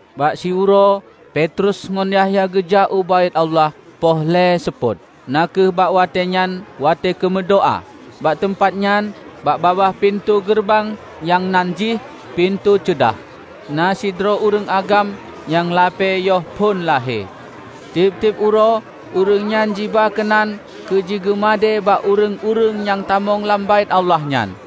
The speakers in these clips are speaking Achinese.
Bak siuroe Petrus ngon Yahya geujak u Baét Allah poh lhée seupôt, na kheueh bak watée nyan watée keu meudoá. Bak teumpat nyan bak babah pintoe geureubang nyang nan jih "Pintoe Ceudah", na sidroe ureuëng agam nyang lapée yoh phon lahé. Tieb-tieb uroe ureuëng nyan jiba keunan keu jigeumadée bak ureuëng-ureuëng nyang tamong lam Baét Allah nyan.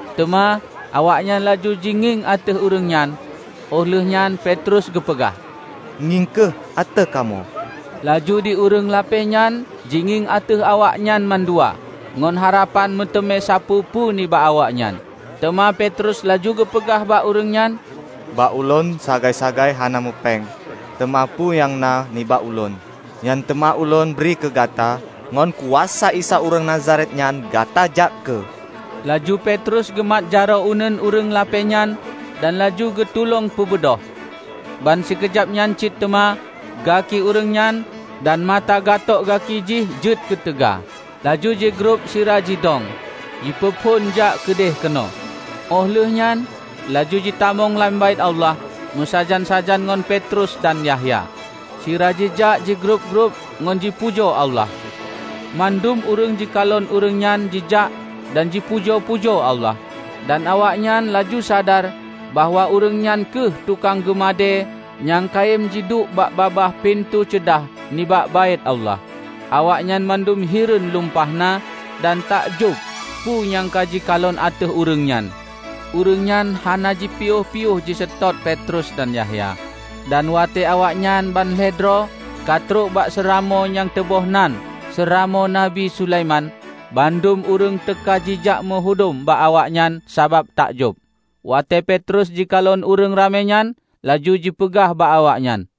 Teuma awaknyan laju jingieng ateueh ureuëng nyan, óh lheueh nyan Petrus geupeugah, "Ngieng kheueh ateueh kamoe!" Laju di ureuëng lapée nyan jingieng ateueh awaknyan mandua ngon harapan meuteumé sapeue-peue nibak awaknyan. Teuma Petrus laju geupeugah bak ureuëng nyan, "Bak Ulôn sagai-sagai hana meupéng. Teuma peue nyang na nibak Ulôn, nyan teuma Ulôn bri keu gata: Ngon kuasa Isa ureuëng Nazaret nyan, gata jak kheueh!" Laju Petrus geumat jaroe uneuen ureuëng lapée nyan dan laju geutulông peubeudôh. Ban sikeujab nyan cit teuma gaki ureuëng nyan dan mata gatok gaki jih jeuet keuteuga. Laju jigrob sira jidong, jipeuphon jak keudeh keunoe. Óh lheuehnyan laju jitamong lam Baét Allah meusajan-sajan ngon Petrus dan Yahya, sira jijak jigrob-grob ngon jipujoe Allah. Mandum ureuëng jikalon ureuëng nyan jijak dan jipujoe-pujoe Allah. Dan awaknyan laju sadar bahwa ureuëng nyan kheueh tukang geumadée nyang kayém jiduek bak babah "Pintoe Ceudah" nibak Baét Allah. Awaknyan mandum hireuen lumpah na dan takjob peue nyang ka jikalon ateueh ureuëng nyan. Ureuëng nyan hana jipiôh-piôh jiseutôt Petrus dan Yahya. Dan watée awaknyan ban lhée droe ka trok bak seuramoe nyang teuboh nan "Seuramoe Nabi Sulaiman", bandum ureuëng teuka jijak meuhudom bak awaknyan sabab takjob. Watée Petrus jikalon ureuëng ramé nyan, laju jipeugah bak awaknyan,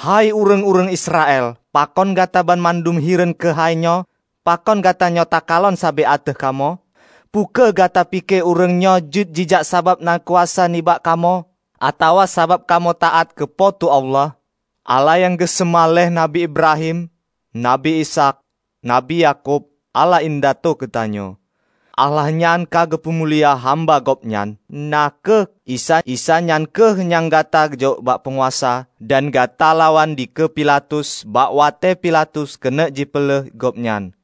"Hei ureuëng-ureuëng Israel, Pakon gata banmandum hireuen keuhai nyoe? Pakon gatanyoe takalon sabe ateueh kamoe? Peu kheueh gata pike ureuëng nyoe jeuet jijak sabab na kuasa nibak kamoe atawa sabab kamoe taát keu Po teu Allah? Allah nyang geuseumah lé Nabi Ibrahim, Nabi Ishaq, Nabi Yakub, Allah indatu geutanyoe, Allah nyan ka geupumulia hamba Gobnyan, na kheueh Isa. Isa nyan kheueh nyang ka gata jok bak peunguasa, dan gata lawan dikeue Pilatus, bak watée Pilatus keuneuk jipeuleueh Gobnyan.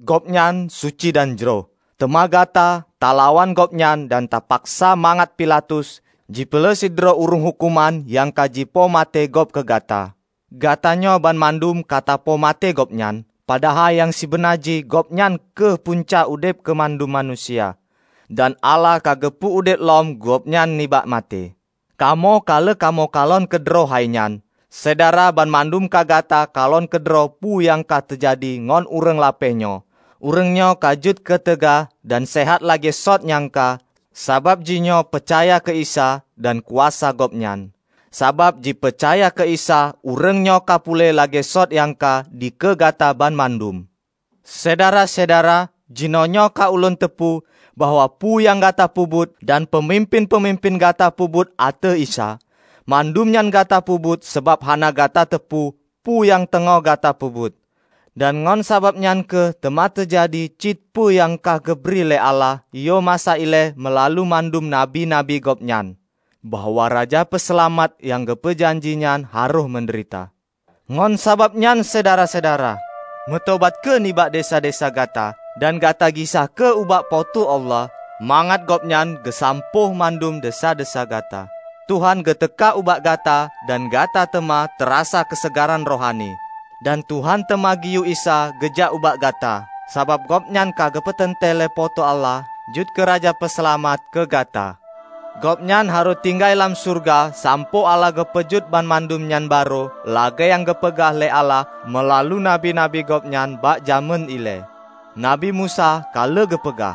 Gobnyan suci dan jroh, teuma gata talawan Gobnyan dan tapaksa mangat Pilatus jipeuleueh sidroe ureuëng huköman nyang ka jipoh maté gob keu gata. Gata nyoe banmandum ka tapoh maté Gobnyan, padahai nyang sibeuna jih Gobnyan kheueh punca udeb keu mandum manusia. Dan Allah ka geupeu udeb lom Gobnyan nibak maté. Kamoe ka lheueh kamoe kalon keudroe hainyan. Syedara banmandum ka gata kalon keudroe peue nyang ka teujadi ngon ureuëng lapée nyoe. Ureuëng nyoe ka jeuet keuteuga dan seuhat lagée sot nyang ka sabab jihnyoe peucaya keu Isa dan kuasa Gobnyan. Sabab jipeucaya keu Isa ureuëng nyoe ka puléh lagée sot nyang ka dikeue gata banmandum. Syedara-syedara! Jinoenyoe ka Ulôn teupeue bahwa peue nyang gata peubuet dan peumimpén-peumimpén gata peubuet ateueh Isa, mandum nyan gata peubuet sabab hana gata teupeue peue nyang teungoh gata peubuet. Dan ngon sabab nyan kheueh teuma teujadi cit peue nyang ka geubri lé Allah yoh masa ilée meulalu mandum nabi-nabi Gobnyan, bahwa Raja Peuseulamat nyang geupeu janjinyan harôh meudeurita. Ngon sabab nyan syedara-syedara, meutobat kheueh nibak desya-desya gata dan gata gisa kheueh ubak Po teu Allah, mangat Gobnyan geusampôh mandum desya-desya gata. Tuhan geuteuka ubak gata dan gata teuma tarasa keuseugaran rohani. Dan Tuhan teuma geuyue Isa geujak ubak gata, sabab Gobnyan ka geupeuteuntée lé Po teu Allah jeuet keu Raja Peuseulamat keu gata. Gobnyan harôh tinggai lam syeuruga sampoe Allah geupeujeuet banmandum nyan barô lagée nyang geupeugah lé Allah meulalu nabi-nabi Gobnyan bak jamén ilée. Nabi Musa ka lheueh geupeugah,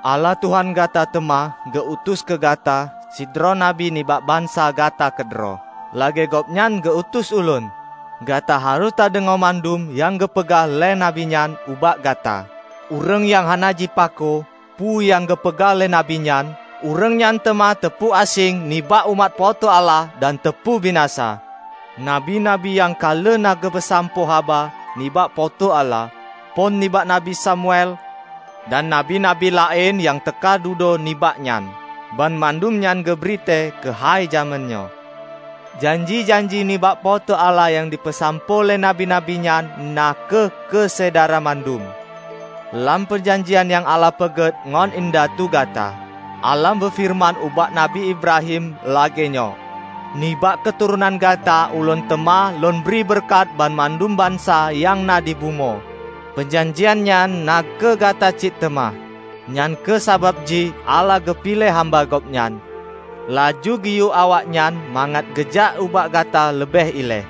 'Allah Tuhan gata teuma geu-utus keu gata sidroe Nabi nibak bansa gata keudroe, lagée Gobnyan geu utus ulôn. Gata harôh tadeungoe mandum nyang geupeugah lé nabi nyan ubak gata. Ureuëng nyang hana jipako peue nyang geupeugah lé nabi nyan, ureuëng nyan teuma teupeu aséng nibak umat Po teu Allah dan teupeubinasa.' Nabi-nabi nyang ka lheueh na geupeusampoe haba nibak Po teu Allah, phon nibak Nabi Samuel dan nabi-nabi laén nyang teuka dudoe nibak nyan, banmandum nyan geubri tée keuhai jamén nyoe. Janji-janji nibak Po teu Allah nyang jipeusampoe lé Nabi-nabi nyan na kheueh keu syedara mandum. Lam peujanjian nyang Allah peugét ngon indatu gata, Allah meufeureuman ubak Nabi Ibrahim lagée nyoe, 'Nibak keuturonan gata Ulôn teuma lôn bri beureukat banmandum bansa nyang na dibumoe.' Peujanjian nyan na kheueh gata cit teuma. Nyang kheueh sabab jih Allah geupiléh hamba Gobnyan, laju geuyue awaknyan mangat geujak ubak gata leubeh ilée,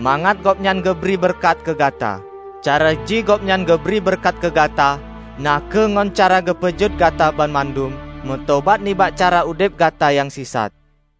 mangat Gobnyan geubri beureukat keu gata. Cara jih Gobnyan geubri beureukat keu gata na kheueh ngon cara geupeujeuet Gata banmandum meutobat nibak cara udeb gata nyang sisat."